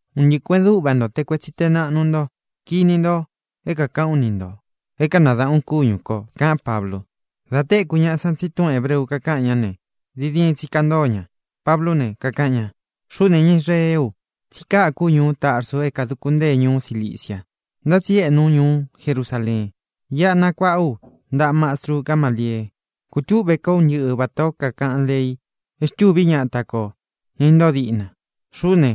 —Un ntɨꞌɨ kuēꞌen dúꞌva nto, te kuetsi te naꞌnu ntó, kini nto é kākaꞌán u ni ntō é kanadaꞌān ú kúñū ko —kaꞌán Pablu. Dā téku ñaꞌa san tsí túꞌūn hebreu kakáꞌan ña ne, diin diin tsi kantóo ña. Pablú ne, kakaꞌan ña: —Xuꞌú ne, ña Israeé u. Tsí kaku ú ñuú Tarsu é kāduku ntée ñuú Cilicia, ntá tsi éꞌnu ú ñuú Jerusaleen. Iꞌa nakuaꞌá u ntaꞌa mastru Gámaliee. Kūtúꞌvē kó un ntɨꞌɨ vatā ó kakaꞌan lei e xtûví ñata kō, ña intóo diꞌna. Xuꞌú ne,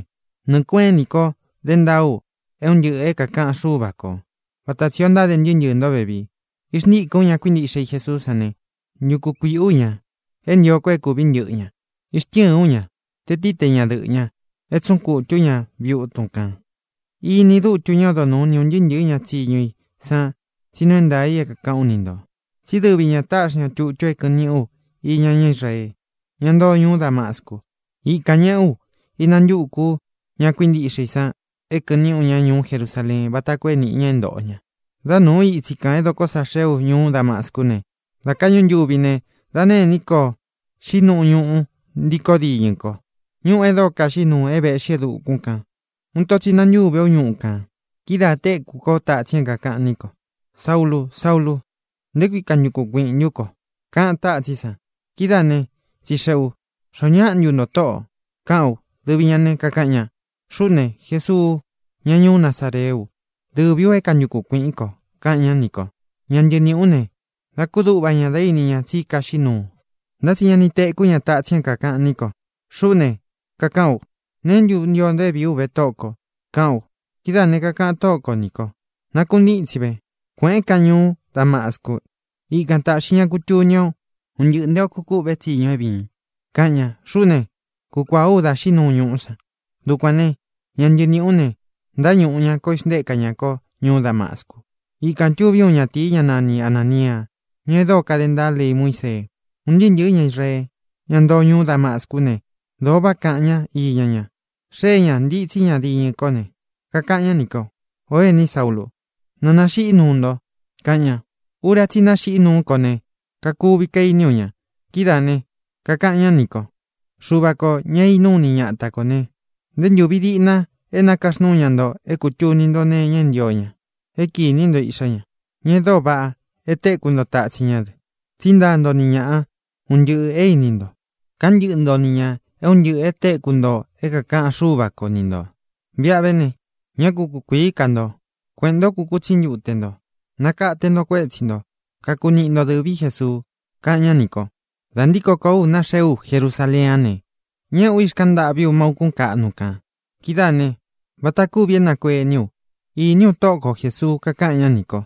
nɨɨ̄ kueꞌén ini ko dé ntaa u é un ntɨꞌɨ̄ é kākaꞌan Xúva kō, vata tsī ó ntáde ntɨɨ́ ntɨɨ̄ ntó vevii. Ixntíkɨ̄n ú ña kuíntiꞌxe i Jesuú san ne, ntuku kuīꞌí u ña, e ntío ko é kūví ntɨꞌɨ ña. Ixtɨ́ɨ̄n ú ña, te tīí, te ñadɨꞌɨ̄ ñá, e tsúꞌun kutū ú ña viꞌi utun kān. Iní dutu ñá odo nūú ni ūn ntɨɨ́ ntɨ̄ɨ́ ña tsiñu i san tsí nuu é ntaā i é kākaꞌán u ni ntō. Tsí dɨvi ñā táꞌxi ña tutu é kɨ̄ꞌɨn níꞌi ú iña ñá Israee, ñá ntoo ñuú Damascu. Ikān ñeꞌé u ínantukū ú ña kuíntiꞌxe i san e kɨꞌɨn niꞌi u ña ñuú Jerusaleen váta koo é niꞌi ña é ntōꞌo ña. ʼDá nūu ú itsi kān é dokó sa xee ú ñuú Damascú ne, dā káꞌñu ntuvi ne, dā nêní ko xiꞌí nuu ñuꞌu ntíkō diñɨ ko, ñuꞌu é dóo kaxiꞌí nuu é vēꞌxí e dukún kān. Uun ito tsi nantúvē ú ñuꞌu kān. Kidáā téku kó tatsin é kākaꞌan ní ko: “Saúlū, Saúlū, ¿nté kui kantukun kuiꞌīn ntún ko?”, kaꞌan tátsín san. Kidáā ne, tsixeꞌē u: “¿Xoó ñaꞌa ntu nto, Tóꞌō?”, kaꞌán u. Dɨvi ñā ne, kakaꞌan ña: “Xuꞌú ne, Jesuu, ñá ñuú Nazareé u. Dɨvī u é kantukun kuīꞌín ko”, kaꞌan ñá nī ko. Ña ntɨɨ niꞌī ú ne, dā kúduꞌva ña dá ini ña tsí kaxiꞌí nuu, ntá tsi ña ni tekú ña tatsin é kākaꞌan ní ko. Xuꞌú ne, kakaꞌán u: “¿Neé ntu ntio nto é vīí u ve, Tóꞌō ko?”, kaꞌán u. Kidáa kākaꞌan Tóꞌo ko nī kó: “Nakuntítsin ve. Kueꞌēn kán ñuú Damascu. Ikan tāꞌxi ñá kutuni o un ntɨꞌɨ̄ nté ō kukûꞌve tsiñu é vīin”, kaꞌan ña. Xuꞌú ne, kukuāá u da xiꞌí nuu ñuꞌú san. Dukuān né, ña ntɨɨ niꞌī ú ne, ntáñūꞌu ña ko, ixntéka ña kó ñuú Damascu. ʼIkān tuví uun ñatīi, ñá nani Anānia, ñá e dóo kade ntaa lei Muísee. Un ntɨɨ́ ntɨ̄ɨ́ ña Israee, ñá ntoo ñuú Damascú ne, dōo váꞌa kaꞌan ñá iña ña. Xée ña, ntītsí ña diñɨ kó ne, kakaꞌan ñá nī kó: “Ō éni Saúlu, na nāxiꞌí nuu nto”, kaꞌan ña. Ura tsí i naxiꞌí nuú ko ne, kakuvi kainí u ña. Kidáā ne, kakaꞌan ñá nī kó: “Xuva kō, ña é inúu ini ñata kō ne, nté ntūvi diꞌna é nakaxnúu ña nto é kūtuni nto nee iña é ntio ña, é kinī ntó Iꞌxá ña, ña e dóo vaꞌa, é tekū ntó tatsin ñá dɨ. Tsí ntaa nto ni ñaꞌa un ntɨꞌɨ̄ é īni nto; káꞌan ntɨꞌɨ nto ni ñā é un ntɨꞌɨ̄ e téku nto é kākaꞌan Xúva ko ni ntō. Viꞌa ve ne, ñá ku kukuīí ka nto. Kueꞌēn ntó, kukutsí ntute nto. Nakate nto kuétsi ntō, kaku niꞌi nto dɨ̄ví Jesuu”, kaꞌan ñá nī ko. ʼDā ntíko kōó u, naxee ú Jerusaleén a ne, ñéꞌē ú, ixkaꞌan ntâꞌví u má ūkún kaꞌnu kān. Kidáā ne, vata kúvi é nakuení u, īní u Tóꞌo ko Jēsuu, kakaꞌan ñá nī kó: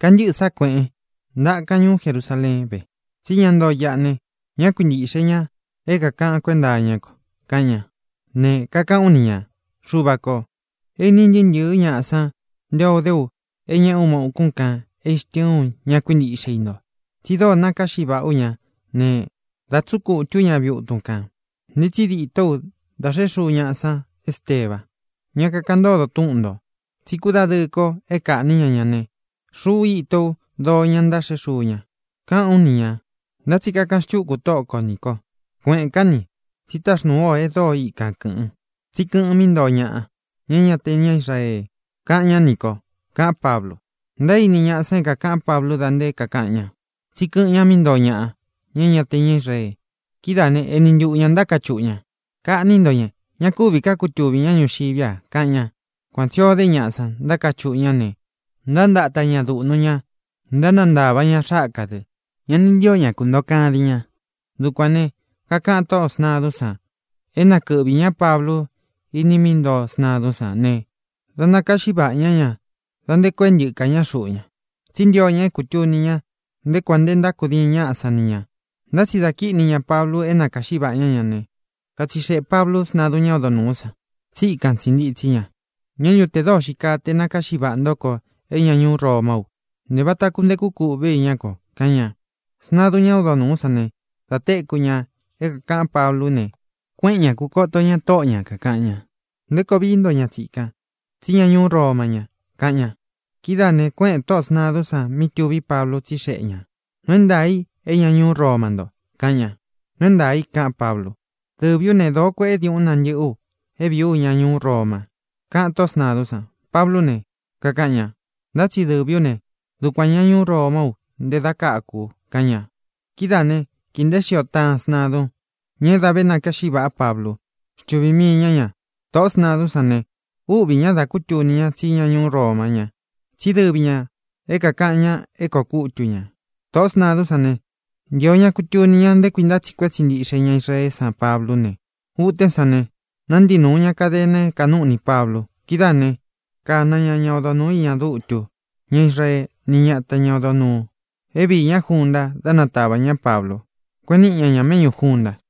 “Kantɨ́ꞌɨ̄ sá kuēꞌen. Ntakan ñuú Jerusaleén ve, tsí ña ntoo iꞌa ne, ñá kuintīꞌxe ña é kākaꞌan kuenta iñá ko”, kaꞌan ña. Ne, kakaꞌán u ni ñā: “Xuvā kó, é īni ntɨɨ́ ntɨ̄ɨ́ ñaꞌa san nté o dé u é ñēꞌé u má ūkún kān, e íxtɨɨn ú ña kuíntiꞌxe i nto. Tsi dóo nakáꞌxi vaꞌá u ña ne, da tsúꞌun kutū ú ña viꞌi utun kān. Ntitsi dîtó u da xeꞌé xuu ñaꞌa san Ésteba, ñá kakaꞌan ntódo túꞌun ntō. Tsi kúdadɨɨ ko é kaꞌnī ñá ña ne, xuꞌu íto ú doo ña ntáxeꞌé xuu ña”, kaꞌán u ni ñā. Ntá tsi kakaꞌan xtúku Tóꞌo ko nī ko: “Kueꞌēn kán ni, tsí taxnūu ú o e dóo ika kɨ̄ꞌɨn. Tsí kɨꞌɨn mí ntoo ñaꞌa, ña é ña te ña Israee”, kaꞌan ñá nī ko —kaꞌán Pablu. Ntaíni ñaꞌa san é kākaꞌán Pablu da nté kakaꞌan ña tsí kɨꞌɨn ña mí ntoo ñaꞌa, ña é ña te ña Israee. Kidáā né, eni ntuꞌu ñā ntákachuꞌu ña: —¡Kaꞌní nto ña! ¡Ña kúvī ká kutuvī ñá ñuxiví a! —kaꞌan ña. Kuan tsī ó de ñaꞌa san, ntákachuꞌu ña ne, ntántata ntaā ñá duꞌnu ña, ntánantavā ña xáka dɨ. Ña ni ntío ña kuntōo kadin ña. Dukuān ne, kakaꞌan tóꞌō sntadún san é nakɨꞌvī ñá Pablu iní i mí ntoo sntadún san ne, dā nakáꞌxi vaꞌā ñá ña da nte koo e ntɨ́ka ña xuꞌu ña. Tsí ntio ña é kūtuni ña nté kuān nte ntákudiin ñaꞌá san ni ñā. Ntá tsi da kíꞌni ña Pablu é nakāꞌxí vaꞌa ñá ña ne, katsixeꞌē Pablu sntadun ñá odo nūú san, tsí ikan tsī ntitsí ña: —¿Ñā ntu te dóo xii kaa te nakāꞌxí vaꞌa ntó ko é ña ñuú Romá u? Ntē vata kuntekú kūꞌvé iñá ko —kaꞌan ña. Sntadun ñá odo nūú san ne, dā téku ña é kākaꞌán Pablú ne, kuéꞌen ña, kūkoto ña tóꞌo ñā, kakaꞌan ña: —¿Nté koo vií nto ña tsikan? Tsí ña ñuú Roma ña —kaꞌan ña. Kidáā ne, kuéꞌēn tóꞌō sntadún san mí tuví Pablu, tsíxeꞌe ñā: —¿Nuu é ntaā ntú i é ña ñuú Roma nto? —kaꞌan ña. —Nuu é ntaā i —kaꞌán Pablu. —Dɨvī ú ne, dōo kueꞌé diuꞌun nantɨ́ꞌɨ u é vīí u ña ñuú Roma —kaꞌan tóꞌō sntadún san. Pablú ne, kakaꞌan ña: —Ntá tsi dɨvī ú ne, dukuān ña ñuú Romá u nté dā káku u —kaꞌan ña. Kidáā né, kīi nteé xio taꞌan sntadun, ña é dā vé nakáꞌxi vāꞌá Pablu, xtuvī mii ña ña. Tōꞌó sntadún san ne, úꞌvī ña da kútuni ña tsí ña ñuú Roma ña, tsí dɨvi ñā é kākaꞌan ña é kōo kútu ñā. Tōꞌó sntadún san ne, ntīo ña kutuni ña nté kui ntátsiꞌi kuetsi ntíꞌxe ña Israeé san Pablú ne, utén san ne, nántii nūu ña kadena é kānúꞌni Pablu. Kidáā né, kāna ña ñá odo nūú iña dutu ñá Israee ni ñata ña odo nūu, é viī ñá junta, da nátavā ñá Pablu, kueꞌen níꞌi ña ña méꞌñū junta.